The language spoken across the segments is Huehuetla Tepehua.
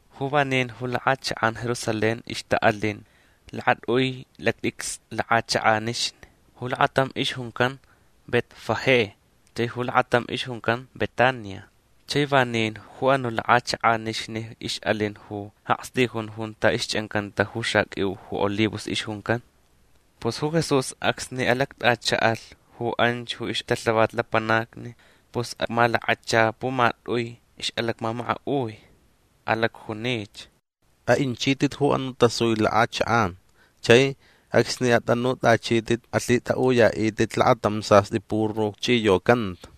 Ju vanin ju lakʼachakʼan Jerusalén ixtaʼalin lakatʼui lactʼicstʼi lakʼachakʼanixni. Ju lakatam ixjuncan Betfagé chai ju lakatam ixjuncan Betania. Chai vanin ju anuʼ lakʼachakʼanixni ixʼalin ju akstijun junta ixchʼancanta ju xaqʼuiu ju olivos ixjuncan. Pus ju Jesús acsni alactʼachaʼalh ju anch ju ixtalhavat lapanacni pus amalakacha pumatʼui ixʼalacmamakaʼui. Alacjunich: ―Aʼinchitʼit ju anuʼ tasui lakʼachakʼan. Chai acsni atʼanutʼachitʼit alhitʼaʼuyaʼitʼit lakatam sastʼi puru chʼiyocanta.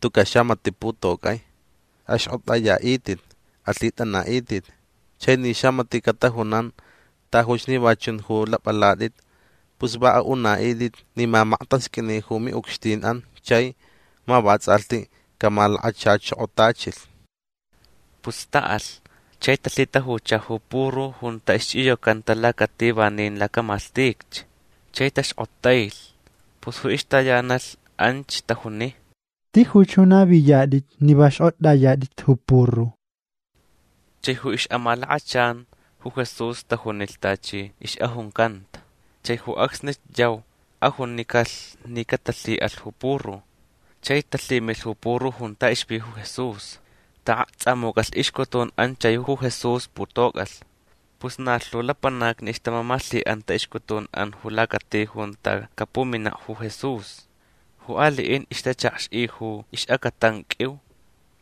Tucaʼ xamatiʼ putocʼai. Axkʼotʼayaʼitʼit. Alhitʼanaʼitʼit. Chai ni xamatiʼ catajunan: “Tajuch ni va chun ju lapʼalatʼit”, pus va aʼunaʼitʼit ni ma maktasqʼuini ju miʼucxtinʼan chai ma vatsʼalhti camalakachachokotachilh. Pus taʼalh. Chai talhitajucha ju puru junta ixchʼiyocanta lacati vanin lacamalhtich. Chai taxkʼotailh. Pus ju ixtayanalh anch tajuni: ―Tijuch ju naviyatʼit ni va xkʼotʼayatʼit ju puru. Chai ju ixʼamalakachan ju Jesús tajunilh tachi ixʼajuncanta. Chai ju acsnich yau ajunicalh ni catalhiʼalh ju puru. Chai talhimilh ju puru junta ixvi ju Jesús. Taʼakxchʼamucʼalh ixcutunʼan chai ju Jesús putocʼalh. Pus na lhu lapanacni ixtamamalhiʼanta ixcutunʼan ju lacati junta capuminaʼ ju Jesús. Ju aliʼin ixtachakxʼi ju ixʼacatan qʼuiu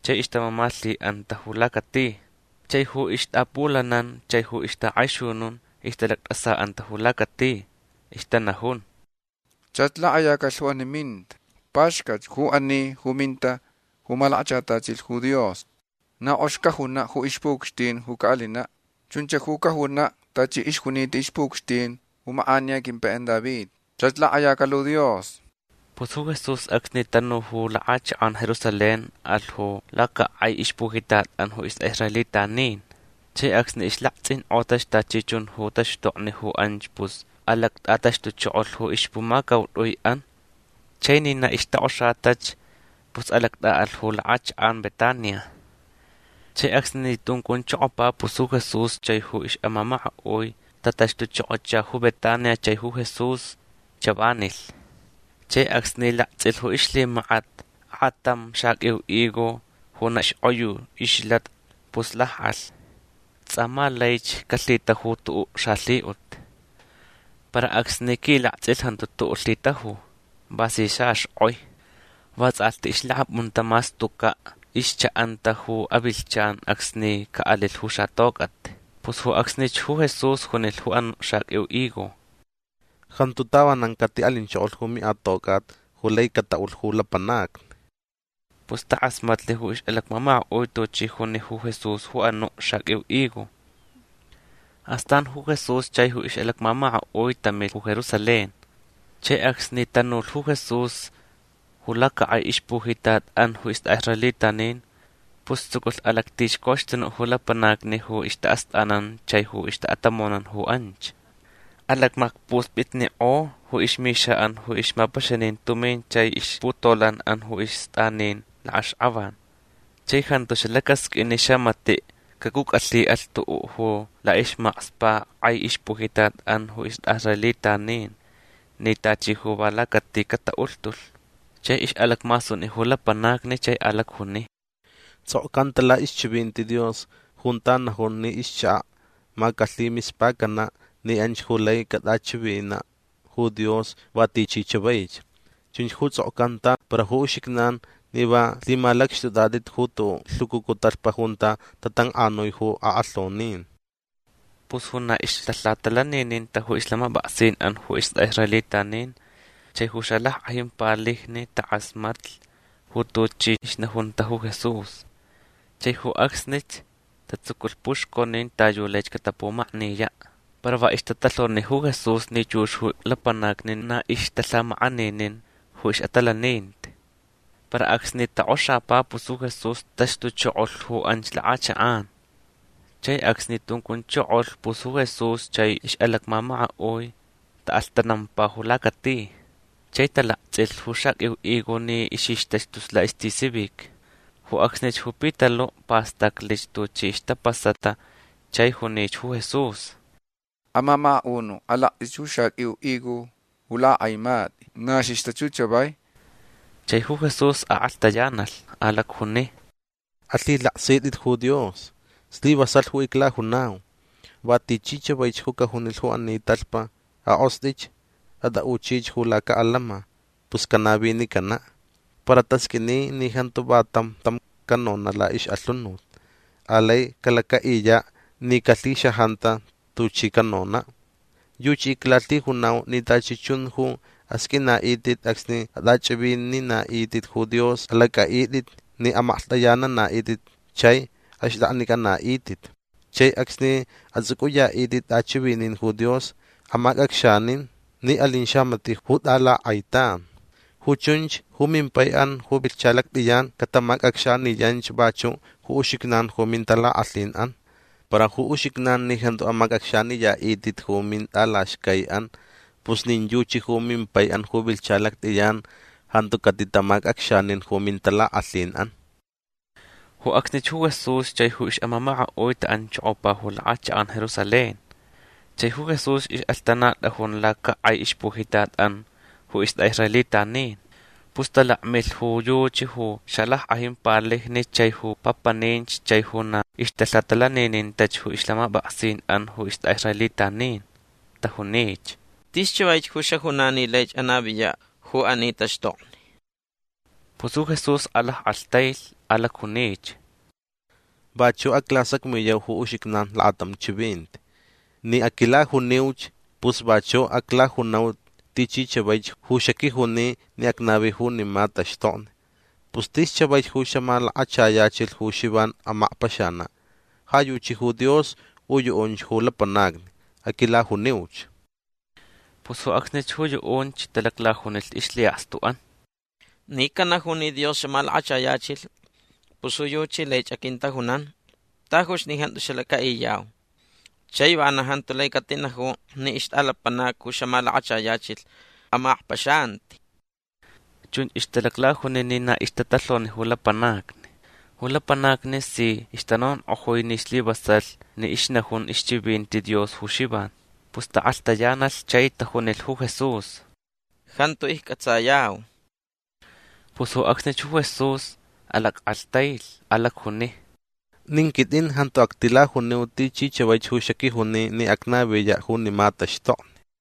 chai ixtamamalhiʼanta ju lacati. Chai ju ixtaʼapʼulanan chai ju ixtakʼaixunun ixtalactʼasaʼanta ju lacati. Ixtanajun: ―Chach lakʼayacalh ju ani minta. Paxcat ju ani ju minta ju malakachatachilh ju Dios. Na kʼox cajunaʼ ju ixpuʼucxtin ju caʼalinaʼ. Chunch ju cajunaʼ tachi ixjunita ixpuʼucxtin ju makʼaniya quimpaiʼan David. Chach lakʼayacalh ju Dios. Pus ju Jesús acsni tanu ju lakʼachakʼan Jerusalén alh ju lacakʼai ixpujitatʼan ju istʼaʼisraelitanin. Chai acsni islaktsʼinkʼotach tachi chun ju taxtokni ju anch pus alactʼataxtuchokolh ju ixpumacautʼuiʼan. Chai ni na ixtokʼoxatach pus alactʼaʼalh ju lakʼachakʼan Betania. Chai acsni tuncunchokopa pus ju Jesús chai ju ixʼamamakaʼui tataxtuchokocha ju Betania chai ju Jesús chavanilh. Chai acsni laktsʼilh ju ixlhimakat akʼatam xaqʼuiu higo ju na xkʼoyu ixlatach pus lakʼalh. Tsʼa ma laich calhitaju tuʼuʼ xalhiʼut. Para acsni quilaktsʼilh jantu tuʼuʼ lhitaju. Va si xaxkʼoi. Va tsʼalhti ixlakapʼunta mas tucaʼ ixchaʼanta ju avilhchan acsni caʼalilh ju xatocʼat. Pus ju acsnich ju Jesús junilh ju anuʼ xaqʼuiu higo: ―Jantu tavanan catiʼalinchokolh ju miʼatocʼat ju lai cataʼulh ju lapanacni. Pus takʼasmatlh ju ixʼalacmamakaʼui tuchi juni ju Jesús ju anuʼ xaqʼuiu higo. Astan ju Jesús chai ju ixʼalacmamakaʼui tamilh ju Jerusalén. Chai acsni tanulh ju Jesús ju lacakʼai ixpujitatʼan ju istʼaʼisraelitanin pus tsuculh alactixcoxtunuʼ ju lapanacni ju ixtaʼastʼanan chai ju ixtaʼatamonan ju anch. Alakmakspuspʼitnikʼo ju ixmixaʼan ju ixmapaxanin tumin chai ixputolanʼan ju istʼanin lakʼaxkʼavan. Chai jantu xalacasqʼuin ni xamatiʼ cacʼucʼalhiʼalh tuʼuʼ ju laʼismakspaʼ kʼai ixpujitatʼan ju istʼaʼisraelitanin ni tachi ju va lacati cataʼulhtulh. Chai ixʼalacmasuni ju lapanacni chai alacjuni: ―Tsʼokcanta laʼixchivinti Dios junta najun ni ixchakaʼ ma calhimispacanaʼ ni anch ju lai catʼachivinaʼ ju Dios va tichi chavaich. Chunch ju tsʼokcanta para ju uxijnan ni va lhimalacxtʼutʼatʼit ju tuʼuʼ lhucucu talhpa junta tatankʼanui ju akʼalhonin. Pus ju na ixtalhatalanininta ju ixlhamapʼaksinʼan ju istʼaʼisraelitanin chai ju xalackʼajin palijni takʼasmatlh ju tuchi ixnajunta ju Jesús. Chai ju acsnich tatsuculh puxconin ta yu laich catapumakniyaʼ. Para va ixtatalhoni ju Jesús ni chux ju lapanacni na ixtalhamakʼaninin ju ixʼatalaninti. Para acsni tokʼoxapa pus ju Jesús taxtuchokolh ju anch lakʼachakʼan. Chai acsni tuncunchokolh pus ju Jesús chai ixʼalacmamakaʼui taʼalhtanampa ju lacati. Chai talaktsʼilh ju xaqʼuiu higo ni ixixtach tus laʼistisivic. Ju acsnich ju Pitaluʼ pastaclich tuchi ixtapasata chai junich ju Jesús: ―Amamakaʼunuʼ alaktsʼich ju xaqʼuiu higo ju lakʼakʼaimatʼi. Na xixtach ju chavai. Chai ju Jesús akʼalhtayanalh. Alacjuni: ―Alhilaksitʼit ju Dios. Slivasalh ju iclajunau. Va tichi chavaich ju cajunilh ju ani talhpa: “Akʼostʼich. Atʼaʼuchich ju lacaʼalama”, pus canavinicanaʼ. Para tasqʼuini ni jantu va tam tam canonaʼ laʼixʼalhunut. Alai calacaʼiyaʼ ni calhixajanta tuchi canonaʼ. Yuchi iclalhijunau ni tachi chun ju asqʼuinaʼitʼit acsni atʼachʼivininaʼitʼit ju Dios alacʼaʼitʼit ni amaklhtʼayananaʼitʼit chai axtʼaknicʼanaʼitʼit. Chai acsni atsʼucʼuyaʼitʼit tʼachʼivinin ju Dios amacʼacxanin ni alin xamatiʼ ju tʼalakʼaitan. Ju chunch ju mimpaiʼan ju vilhcha lactʼiyan catamacʼacxaniyanch vachuʼ ju uxijnan ju mintalakʼalhinʼan. Para ju uxijnan ni jantu amacʼacxaniyaʼitʼit ju mintʼalaxcaiʼan pus nin yuchi ju mimpaiʼan ju vilhcha lactʼiyan jantu catitamacʼacxanin ju mintalakʼalhinʼan. Ju acsnich ju Jesús chai ju ixʼamamakaʼui taʼanchokopa ju lakʼachakʼan Jerusalén. Chai ju Jesús ixʼalhtanatʼajun lacakʼai ixpujitatʼan ju istʼaʼisraelitanin. Pus talakmilh ju yuchi ju xalackʼajin palijni chai ju papaninch chai ju na ixtalhatalaninintach ju ixlhamapʼaksinʼan ju istʼaʼisraelitanin. Tajunich: ―Tis chavaich ju xajunan ni laich anaviyaʼ ju ani taxtokni. Pus ju Jesús alackʼalhtailh. Alacjunich: ―Vachuʼ aclasacmiyau ju uxijnan lakatam chivinti. Ni aquilajuniuch pus vachuʼ aclajunau tichi chavaich ju xaquijuni ni acnavi junima taxtokni. Pus tis chavaich ju xamalakachayachilh ju Xivan amakpaxanaʼ. Ja yuchi ju Dios u yuʼunch ju lapanacni. Aquilajuniuch. Pus ju acsnich ju yuʼunch talaclajunilh ixlhiʼakstuʼan: ―Ni canaju ni Dios xamalakachayachilh pus ju yuchi laich aquintajunan tajuch ni jantu xalacaʼiniyau. Chai vana jantu lai catinaju ni ixtʼalapanac ju xamalakachayachilh amakpaxanaʼ. Chunch ixtalaclajuni ni na ixtatalhoni ju lapanacni. Ju lapanacni si ixtanonkʼojui ni slivasalh ni ixnajun ixchivinti Dios ju Xivan. Pus taʼakʼalhtayanalh chai tajunilh ju Jesús: ―Jantu iccʼatsayau. Pus ju acsnich ju Jesús alackʼalhtailh. Alacjuni: ―Nin quitʼin jantu actilajuniu tichi chavaich ju xaquijuni ni acnaviyaʼ junima taxtokni.